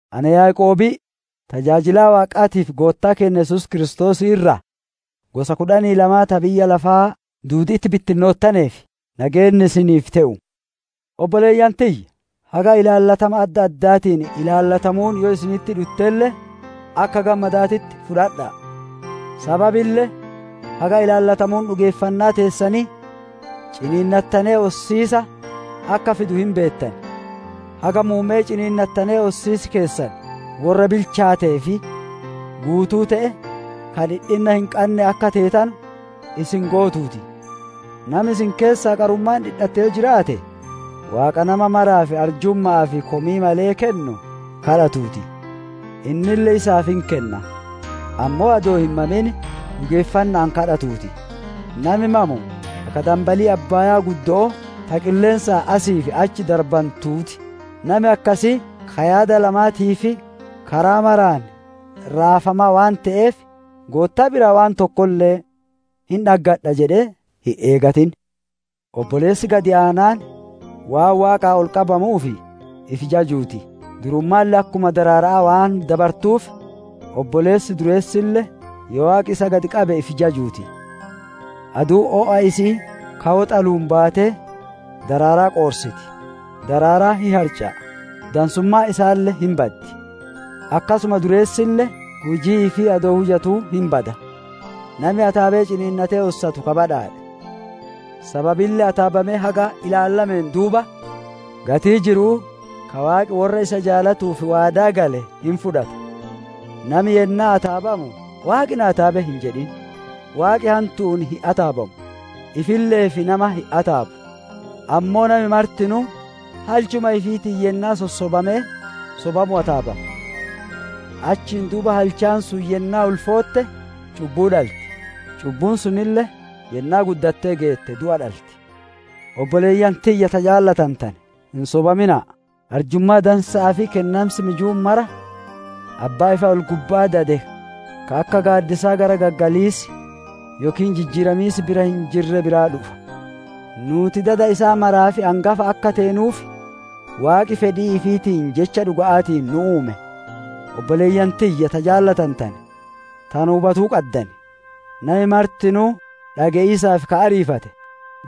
Ana Yaaqoobii tajaajilaa Waaqaatii fi Goottaa keenna Yesuus Kiristoosii irraa, gosa kudhanii lama ta biyya lafaa duudi'itti bittinnoottaneef: Nageenni isiniif te'u. Obboleeyyan tiyya! Haga ilaallatama adda addaatiin ilaallatamuun yoo isinitti dhuttelle, akka gammadaatitti fudhadha'a! Sababille haga ilaallatamuun dhugeeffannaa teessanii ciniinnattanee ossiisa akka fidu hin beettan. Haga muumme'ee ciniinnattanee ossiis keessan worra bilchaatee fi guutuu te'e, ka dhidhinna hin qanne akka teetanu isin gootuu ti. Nami isin keessaa qarummaan dhidhatte yoo jiraate, Waaqa nama maraaf arjumma'aa fi komii malee kennu gaafatuu ti! Innille isaaf hin kenna. Ammoo adoo hin mamin dhugeeffanna'aan gaafatuu ti; nami mamu akka danbalii abbaaya'aa ta qilleensaan asii fi achi darbantuu ti. Nami akkasii, ka yaada lamaatii fi karaa maraan raafamaa waan te'eef, Goottaa biraa waan tokkolle hin dhaggadha jedhee hin eegatin. Obboleessi gad aanaan, waan Waaqaan ol qabamuuf ifi jajuu ti! Durummaalle akkuma daraara'aa waan dabartuuf, obboleessi dureessille yoo Waaqi isa gad qabe ifi jajuu ti! Aduun o'a isi'ii ka woxaluun baatee daraaraa qoorsiti; daraaraan hin harca'a, dansummaan isaalle hin baddi. Akkasuma dureessille, hujii ifii adoo hujatuu hin bada. Nami ataabee ciniinnatee ossatu ka badhaadhe. Sababille ataabamee haga ilaallameen duuba, gatii jiru'uu ka Waaqi worra isa jaalatuuf waadaa gale hin fudhata. Nami yennaa ataabamu, «Waaqi na ataabe» hin jedhin; Waaqi hantu'uun hin ataabamu; ifille'eef nama hin ataabu. Ammoo nami martinuu halchuma ifiitiin yennaa sossobamee sobamu ataabama. Achiin duuba, halchaan sun yennaa ulfootte, cubbuu dhalti; cubbuun sunille, yennaa guddattee geette, du'a dhalti. Obboleeyyan tiyya ta jaalatantane, hin sobamina'a. Arjummaa dansa'aa fi kennansi mijuun mara abbaa ifa ol-gubba'aa dade, ka akka gaaddisaa garagaggaliis yookiin jijjiiramiis bira hin jirre biraa dhufa. Nuuti dada isaa maraaf angafa akka teenuuf, Waaqi fedhii ifiitiin jecha dhuga'aatiin nu uume. Obboleeyyan tiyya ta jaalatantane, tana hubatuu qaddan! Nami martinuu dhage'iisaaf ka ariifate,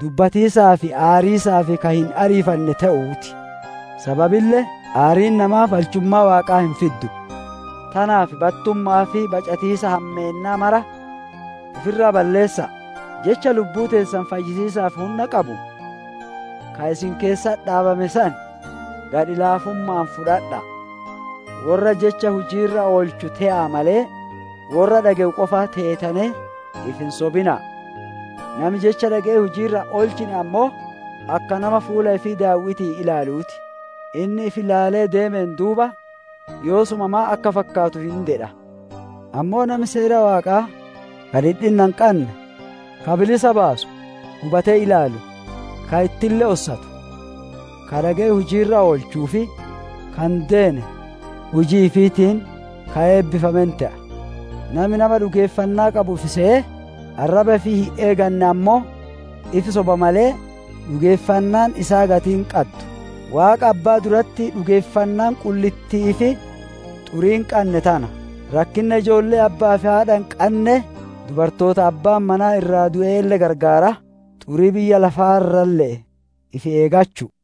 dubbatiisaa fi aariisaaf ka hin ariifanne te'uu ti; sababille aariin namaa balchummaa Waaqaa hin fiddu. Tanaaf battumma'aa fi bacatiisa hammeennaa mara ifi irraa balleessa'a; jecha lubbuu teessan fayyisiisaaf hunna qabu, ka isin keessatti dhaabame san gadhi laafumma'aan fudhadha'a. Worra jecha hujii irra oolchu te'aa malee, worra dhage'u qofa teetanee ifi hin sobina'a. Nami jecha dhage'ee hujii irra hin oolchine ammoo, akka nama fuula ifii daaw'iti'iin ilaaluu ti; inni ifi ilaalee deemeen duuba, yoosuma maan akka fakkaatu hin dedha. Ammoo nami Seera Waaqaa ka dhidhinna hin qanne, ka bilisa baasu hubatee ilaalu, ka ittille ossatu, ka dhage'ee hujii irra oolchuu fi ka hin deene hujii ifiitiin ka eebbifame hin te'a. Nami, nama dhugeeffannaa qabu ifi seyee, arraba ifii hin eeganne ammoo ifi soba malee, dhugeeffannaan isaa gatii hin qaddu. Waaqa Abbaa duratti dhugeeffannaan qullitti'ii fi xurii hin qanne tana: rakkinna ijoollee abba'aa fi haadha hin qannee, dubartoota abbaan manaa irraa du'eelle gargaaraa, xurii biyya lafaa irralle'ee ifi eeggachu'u.